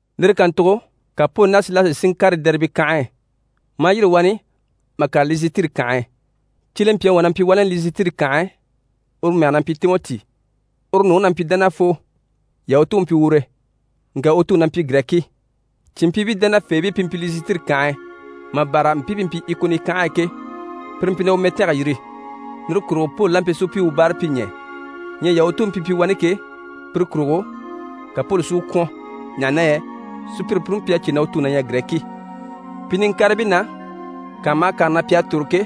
Lire kàntugo ka Poli ná Silasi si ŋkàre Dɛribe kànhe e, maa yîri wani mà kàre Lisitiri kànhe e. Cyelempyaŋi wà na mpyi wani Lisitiri kànhe e, uru mɛge na mpyi Timɔti. U nuŋi na mpyi dánafoo, Yahutu u mpyi ure, ŋka u tuŋi na mpyi Girɛki. Cìnmpyiibii dánafeebii pi mpyi Lisitiri kànhe e, mà bâra mpii pi mpyi Ikoni kànhe e ke, pire mpyi na u mɛtange yiri. Lire kurugo Poli la mpyi si u pyi u báarapyiɲɛɛ. Ɲyɛ Yahutuubii pi mpyi wani ke, pire kurugo, ka Poli si u kwɔ̀n, ɲaha na yɛ sùpyire puni mpyi a cè na u tuŋi na ɲyɛ Girɛki. Pi niŋkaribii na, kànha maha kànha na pi à tòro ke,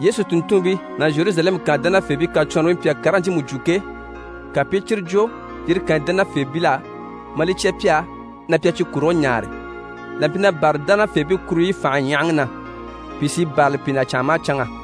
Yesu tùnntunmpii ná Zheruzalɛmu kànhe dánafeebii kacwɔnribii mpyi a karigii ɲcyiimu jwo ke, ka pi i cyire jwo yire kànyi dánafeebil'á, maa li cya pi á, na pi a cyi kurigii ɲaare. Là mpyi na bârali dánafeebii kuruɲyi fànhe ɲyahaŋi na, pìi sí i bârali pi na canŋa maha canŋa.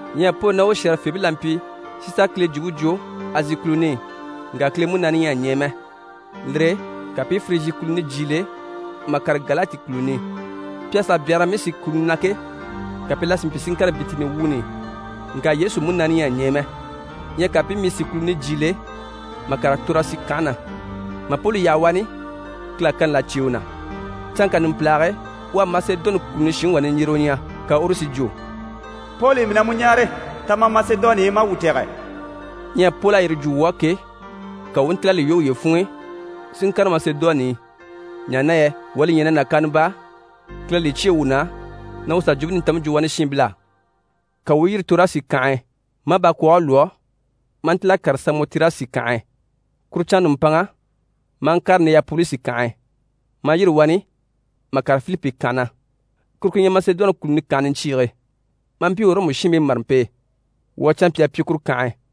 Ɲyɛ Poli ná u shɛ̀rɛfeebii la mpyi si sà Kile jwumpe jwo Azi kùluni i, ŋka Kile Munaani ɲyɛ a ɲɛɛ mɛ. Lire e ka pi i Firijyi kùluni jyiile mà kàre Galati kùluni i. Pi à sà byanhara Misi kùluni na ke, ka pi la si mpyi si ŋkàre Bitini wuuni i, ŋka Yesu Munaani ɲyɛ a ɲɛɛ mɛ. Ɲyɛ ka pi i Misi kùluni jyiile mà kàre Torasi kànhe na. Mà Poli yaha wani, Kile à kani là cyêe u na. Canŋka numpilage e, u à Masedoni kùluni shinŋi wà niɲjyerewe ɲya, ka uru si jwo: «Poli, mii na mu ɲáare, ta ma Masedoni i ma a wuu tɛ̀gɛ.» Ɲyɛ Poli à yire jwo wuu á ke, ka wuu u ntíl'a li lwɔ́ wuye funŋ'i si ŋkàre Masedoni i, ɲaha na yɛ wuu à li ɲya na nàkaana baa, Kile à li cyêe wuu na na wuu sà Jwumpe Nintanmpe jwo wani shiinbil'á. Ka wuu u yîri Torasi kànhe e, maa bakwɔɔge lwɔ́ maa ntíl'a kàre Samɔtirasi kànhe e. Kuru canŋa nùmpanŋa, maa ŋkàre Nɛyapolisi kànhe e. Maa yîri wani mà kàre Filipi kànhe na, kuru ku ɲyɛ Masedoni kùluni kànhe niɲcyiige, maa mpyi Ɔrɔmu shiinbii màrampe e. Wuu à canmpyaa pyi kuru kànhe e.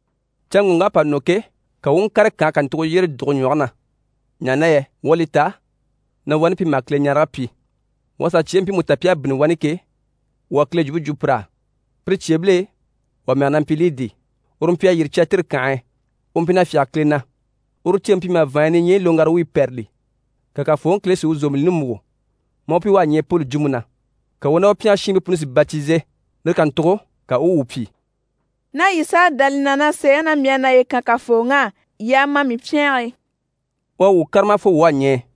Canŋɔŋk'à pa nɔ ke, ka wuu u ŋkàre kànhe kàntugo yyére dùge ɲwɔge na, ɲaha na yɛ wuu à li ta na wani pi maha Kileɲarege pyi. Wuu à sà cyeebii mpiimu ta pi à bínni wani ke, wuu à Kile jwumpe jwo pir'á. Pire cyeebil'e, wà mɛge na mpyi Lidi, uru mpyi a yîri Cyatiri kànhe e, u mpyi na fyáge Kile na. Uru ceeŋi mpyi maha vàanɲyi niɲyɛyi loŋgara wuyi pɛ́rɛli. Ka Kafooŋi Kile si u zòmbilini múgo, maa u pyi u à ɲɛɛ Poli jwumpe na. Ka u ná u pyɛngɛ shiinbii puni si batize. Lire kàntugo ka u u wuu pyi: «Ná yii s'à dá li na na sèeŋi na mii à naye kan Kafooŋi á, yii a ma mii pyɛnge e.» U à wuu kárama fo wuu à ɲɛɛ.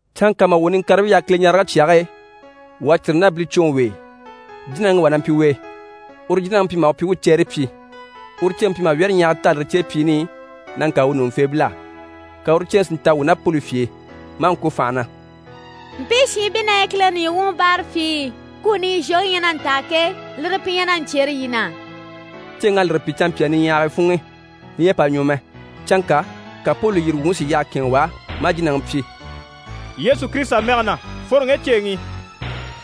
Canŋka mà wuu niŋkaribii yaha Kileɲarege cyage e, wuu à círi ná bilicwoŋi w'e. Jínaŋi wà na mpyi u e, uru jínaŋi mpyi maha u pyi u u cɛɛre pyi. Uru ceeŋi mpyi maha wyɛ́rɛɲyahaga taa lire céepyiini i na ŋkaan u ɲùŋufeebil'á. Ka uru ceeŋi si ntaha wuu ná Poli fye e, maa ŋko fànha na: «Mpii shiinbii na ɲyɛ Kileŋi nìɲyi wuŋi báarapyii. Kuni i zhwoŋi ɲyɛ na ntaa ke, lire pi ɲyɛ na ɲcyêre yii na.» Ceeŋ'à lire pyi canmpyaa niɲyahagii funŋ'i, li ɲyɛ a pa ɲwɔ mɛ. Canŋka ka Poli lùyiri wuŋi si yyaha kɛ̂ɛnŋɛ u á, maa jínaŋi pyi: «Yesu Kirisita mɛge na, fworo ŋge ceeŋi i.»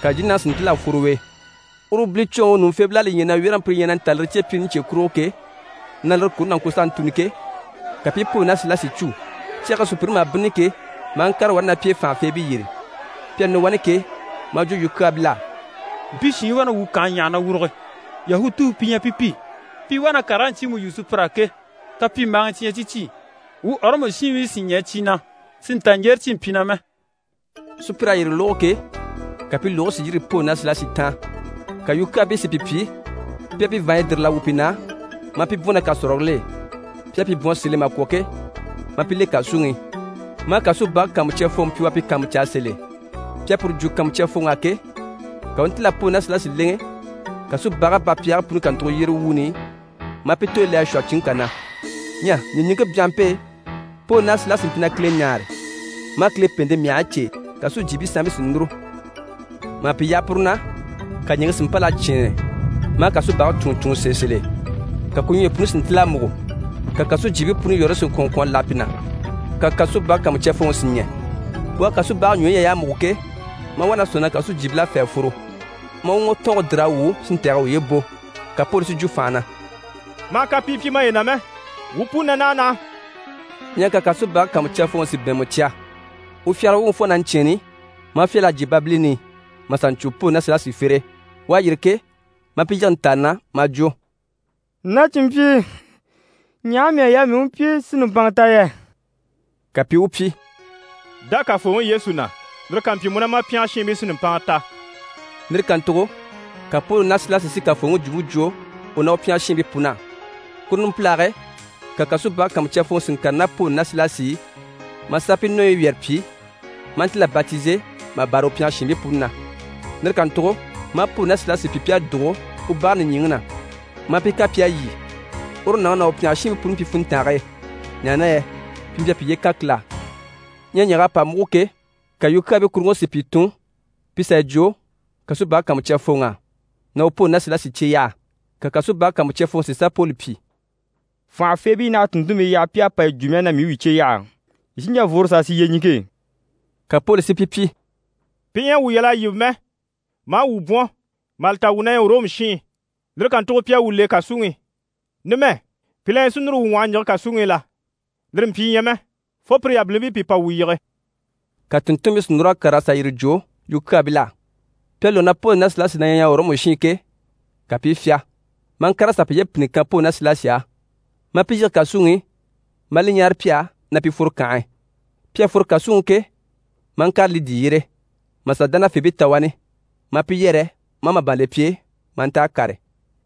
Ka jínaŋi si ntíl'a fworo u e. Uru bilicwoŋi ɲùŋufeebil'à li ɲya na wyɛ́rɛŋi pire ɲyɛ na ntaa u céepyiini cye kurugo ke, na lire kuni na ŋko s'a ntùni ke, ka pi i Poli ná Silasi cû, cyage e sùpyire maha bínnini ke, maa ŋkàre wani ná pi e fànhafeebii yyére. Pi à nɔ wani ke, maa jwo yukyaabil'á: «Mpii shiinbii wá na wuu kànhe ɲyàha na wùruge. Yahutuu pi ɲyɛ pi pi. Pi wá na karigii ɲcyiimu yu sùpyir'á ke, kapyimbaagii cyi ɲyɛ cyi cyi, wuu Ɔrɔmu shiinbii sì ɲɛɛ cyi na, si nta ɲjyere cyi mpyi na mɛ.» Sùpyir'à yire lógo ke, ka pi lùgigii si yîri Poli ná Silasi taan. Ka yukyaabii si pi pyi pi à pi vàanɲyi dìril'a wwû pi na, maa pi bwɔ̀n ná kàsɔrigil'e. Pi à pi bwɔ̀n sèl'e mà kwɔ̀ ke, maa pi le kàsuŋi i, maa kasubage kàanmucyafooŋi pyi u a pi kàanmucaa sèl'e. Pi à puru jwo kàanmucyafooŋ'á ke, ka u u ntíl'a Poli ná Silasi lèŋɛ kasubage bapyɛɛgii puni kàntugo yyére wuuni i, maa pi tooyi le a shwɔ̂hɔ cinŋke kà na. Ɲyɛ ɲìɲiŋke byanhampe e, Poli ná Silasi mpyi na Kile ɲáare, maa Kile pèente myahigii cêe, kàsujyiibii sanmpii sí i núru. Mà pi yaha puru na, ka ɲìŋke si mpâl'a cyɛ̂ɛnnɛ, maa kasubage cúnŋɔ cúnŋɔ sèe sèl'e, ka ku ɲwɔyi puni si ntíl'a múgo, ka kàsujyiibii puni yɔ̀rɔyi si ŋkwɔ̀n ŋkwɔ̀n a láha pi na. Ka kasubage kàanmucyafooŋi si ɲɛ̀. U à kasubage ɲwɔyi ɲya y'à múgo ke, maa wá na sɔ̂nŋi na kàsujyiibil'à fê a fworo, maa u ŋwɔtɔɔnge dìr'a wwû si ntɛ̀gɛ uye bò. Ka Poli si jwo fànha na: «Ma hà kapii pyi maye na mɛ! Wuu puni na naha naha!» Ɲyɛ ka kasubage kàanmucyafooŋi si bɛ̀ɛnmɛ cya. U fyagara wuŋi fo na ɲcyɛ̂ɛnni, maa fyâl'a jyè babilini i, mà sà ɲcwo Poli ná Silasi fere e. U à yîri ke, maa pi yige ntàani na, maa jwo: «Na cìnmpyii, ɲaha mii à yaa mii u pyi si nùmpanŋa ta yɛ?» Ka pi i u pyi: «Dá Kafooŋi Yesu na, lire ká mpyi, mu ná ma pyɛngɛ shiinbii sí nùmpanŋa ta.» Lire kàntugo ka Poli ná Silasi si Kafooŋi jwumpe jwo u ná u pyɛngɛ shiinbii pun'á. Kuru numpililyage e, ka kasubage kàanmucyafooŋi si ŋkàre ná Poli ná Silasi i, maa sà pi nɔɔyi wyɛrɛ pyi, maa ntíl'a batize mà bâra u pyɛngɛ shiinbii puni na. Lire kàntugo maa Poli ná Silasi pyi pi à dùgo u bage nìɲyiŋi na, maa pi kan pi à lyî. Uru nàŋi ná u pyɛngɛ shiinbii puni mpyi funntange e, ɲaha na yɛ pi mpyi a piye kan Kile á. Ɲyɛ ɲyɛ̀g'à pa múgo ke, ka yukyaabii kuruŋke si pìi tun pi sà yi jwo kasubage kàanmucyafooŋ'á na u Poli ná Silasi cye yaha. Ka kasubage kàanmucyafooŋi si sà Poli pyi: «Fànhafeebii naha a tùnntunmii yaha pi à pa yi jwo mii á na mii u yii cye yaha. Yii sí n‑jà n‑fworo s'a sì yyeɲiŋke e.» Ka Poli si pi pyi: «Pi ɲyɛ a wuu yal'a yíbe mɛ, maa wuu bwɔ̀n, mà li ta wuu na ɲyɛ Ɔrɔmu shiin. Lire kàntugo pi à wuu le kàsuŋi i. Numɛ, pi la na ɲyɛ si núru wuu ŋwɔhɔ ɲjige kàsuŋi i la? Lire mpyi ɲyɛ mɛ, fo pire yabilimpii pi pa wuu yige.» Ka tùnntunmpii si núr'a kàr'a sà yire jwo yukyaabil'á. Pi à lógo na Poli ná Silasi na ɲyɛ Ɔrɔmu shiin ke, ka pi i fyá, maa ŋkàr'a sà piye mpìnni kan Poli ná Silasi á, maa pi yige kàsuŋi i, maa li ɲáare pi á na pi fworo kànhe e. Pi à fworo kàsuŋi i ke, maa ŋkàre Lidi yyére, mà sà dánafeebii ta wani, maa pi yɛrɛ maa màban le pi e, maa nta a kàre.